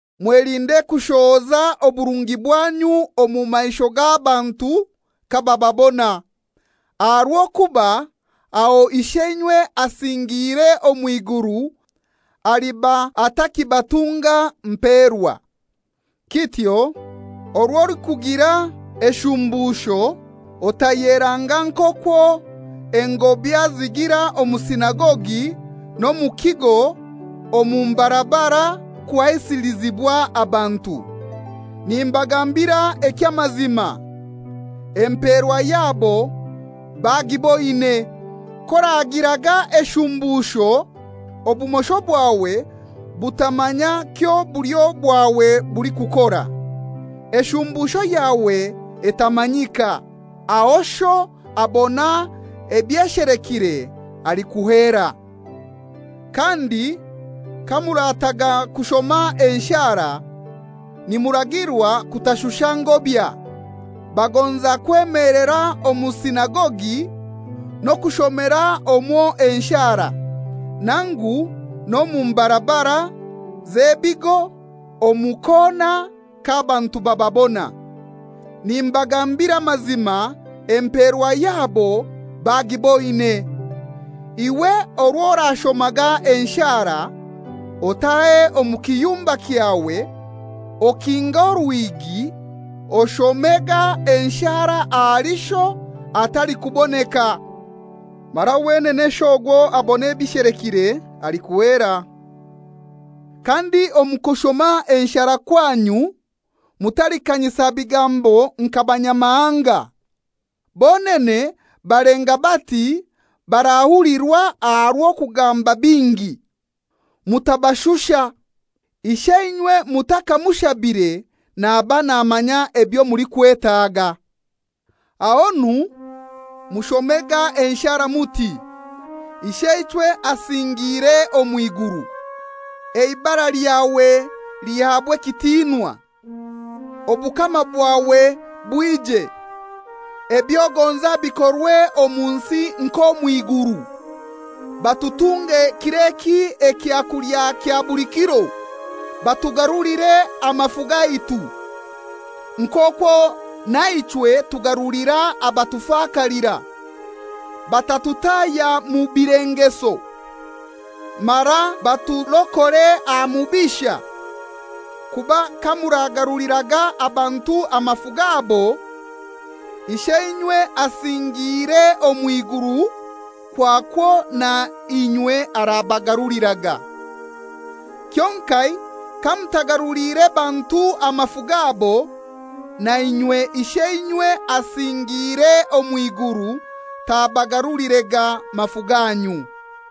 «Mwelinde kushohoza oburungi bwanyu omu maisho g'abantu kabababona. Aha rw'okuba aho Isheinywe asingiire omw'iguru aliba atakibatunga mperwa. Kityo orw'olikugira eshumbusho otayeranga nk'okwo engobya zigira omu sinagogi n'omu kigo omu mbarabara kuhaisilizibwa abantu. Nimbagambira eky'amazima, emperwa yabo bagiboine. K'oragiraga eshumbusho, obumosho bwawe butamanya kyo bulyo bwawe bulikukora, eshumbusho yawe etamanyika. Aho Sho abona ebyeshelekire alikuheera.» «Kandi kamurataga kushoma enshara, nimuragirwa kutashusha ngobya. Bagonza kwemelera omu sinagogi n'okushomera omwo enshara, nangu n'omu mbarabara z'ebigo omu kona k'abantu bababona. Nimbagambira amazima emperwa yabo bagiboine. Iwe orwo orashomaga enshara, otahe omu kiyumba kyawe, okinge orwigi, oshomega enshara ahali Sho atalikuboneka. Mara wenene Sho ogwo abona ebishelekire alikuheera. Kandi omu kushoma enshara kwanyu mutalikanyisa bigambo nka banyamahanga. Bonene balenga bati barahulirwa aha rw'okugamba bingi. Mutabashusha. Isheinywe mutakamushabire naba namanya ebyo mulikwetaga.» Ahonu mushomega enshara muti, «Isheichwe asingiire omw'iguru, eibara lyawe lihabwe ekitinwa. Obukama bwawe bwije, eby'ogonza bikorwe omu nsi nk'omwiguru. Batutunge kir'eki ekyakulya kya buli kiro. Batugarulire amafu gaitu, nk'okwo naichwe tugarulira abatufakalira. Batatutahya mu bilengeso. Mara baturokore aha Mubisha. Kuba kamuragaruliraga abantu amafu gabo, Isheinywe asingiire omw'iguru kwakwo na inywe arabagaruliraga. Kyonkai kamutagaruliire bantu amafu gabo, na inywe Isheinywe asingiire omw'iguru tabagarulirega mafu ganyu.»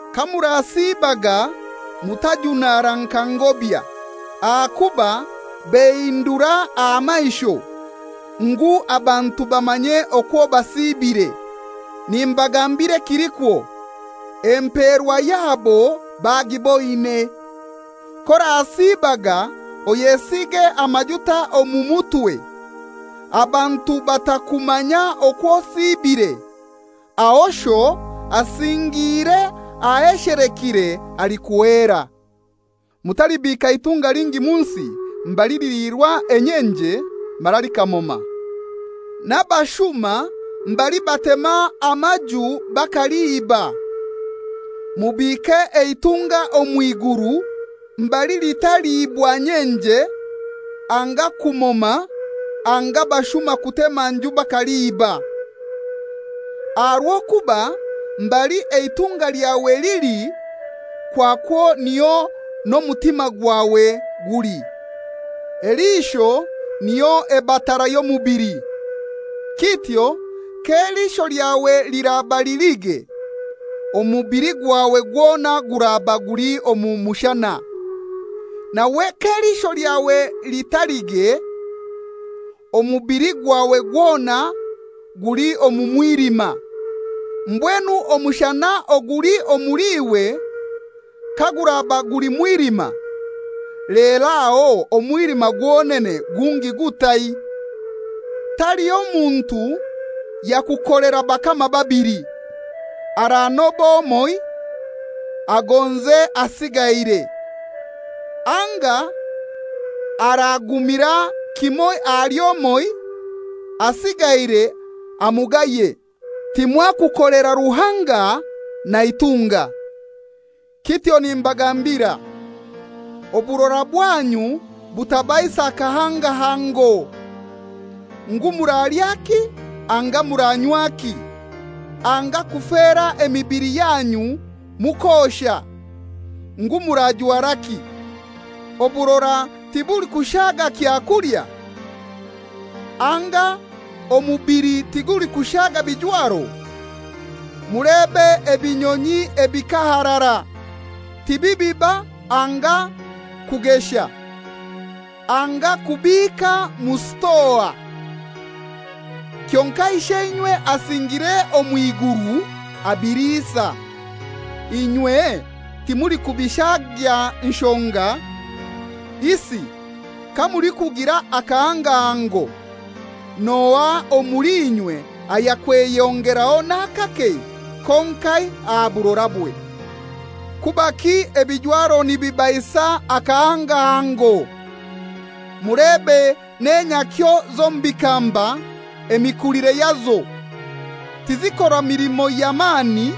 «Kamurasiibaga mutajunara nka ngobya, ahakuba behindura aha maisho, ngu abantu bamanye okwo basiibire. Nimbagambira ekilikwo, emperwa yabo bagiboine. K'orasiibaga oyesige amajuta omu mutwe abantu batakumanya okwo osibire, aho Sho asingiire aheshelekire alikuheera.» «Mutalibiika itunga lingi mu nsi mbali liliirwa enyenje mara likamoma, n'abashuma mbali batema amaju bakaliiba. Mubiike eitunga omw'iguru, mbali litaliibwa nyenje anga kumoma anga bashuma kutema nju bakaliiba. Aha rw'okuba mbali eitunga lyawe lili kwakwo niho n'omutima gwawe guli.» «Eliisho niyo eba tara y'omubili. Kityo k'eliisho lyawe liraba lilige, omubili gwawe gwona guraba guli omu mushana. Nawe k'eliisho lyawe litalige, omubili gwawe gwona guli omu mwilima. Mbwenu omushana oguli omuli iwe kaguraba guli mwilima, lero aho omwilima gwonene gungi gutai?» « Taliho muntu yakukolera bakama babili. Aranoba omoi, agonze asigaire; anga aragumira kimoi ahali omoi, asigaire amugaye. Timwakukolera Ruhanga na itunga. Kityo nimbagambira, oburora bwanyu butabaisa kahangahango, ngu muralyaki anga muranywaki, anga kufera emibili yanyu mukosha, ngu murajwaraki. Oburora tibulikushaga kyakulya? Anga omubili tigulikushaga bijwaro? Mulebe ebinyonyi ebikaharara, tibibiba anga kugesha anga kubiika mu sitoa. Kyonkai Isheinywe asingiire omw'iguru abiliisa. Inywe timulikubishagya nshonga? Isi kamulikugira akahangahango, n'ohai omuli inywe ayakweyongeraho n'akake konkai aha burorabwe?» «Kubaki ebijwaro nibibaisa akahangahango? Mulebe n'enyakyo z'omu bikamba emikulire yazo. Tizikora milimo ya mani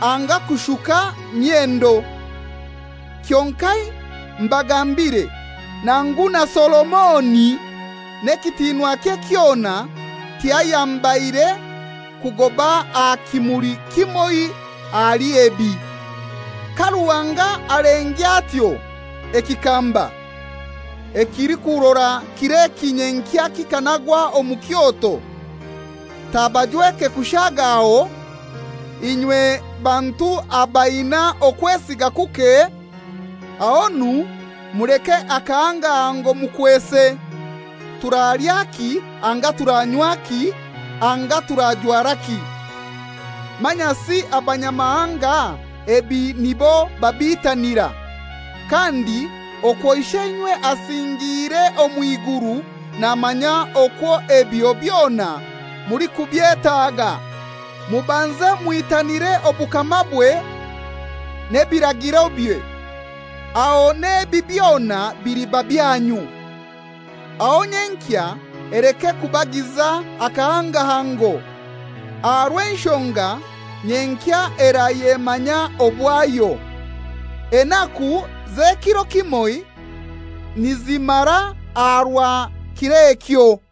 anga kushuka myendo; kyonkai mbagambire, nangu na Solomoni n'ekitinwakye kyona tiyayambaire kugoba aha kimuli kimoi ahali ebi. Ka Ruhanga alengya atyo ekikamba, ekilikurora kir'eki, nyenkya kikanagwa omu kyoto, tabajweke kushagaho, inywe bantu abaina okwesiga kuke? Ahonu muleke akahangahango mukwese, ‹Turalyaki anga turanywaki anga turajwaraki?› Manyasi abanyamahanga ebi nibo babiitanira, kandi okwo Isheinywe asingiire omw'iguru namanya okwo ebyo byona mulikubyetaga. Mubanze mwitanire obukamabwe n'ebiragirobye, aho n'ebi byona biliba byanyu. Aho nyenkya eleke kubagiza akahangahango, aha rw'enshonga nyenkya erayemanya obwayo. Enaku z'ekiro kimoi nizimara aha rwa kir'ekyo.»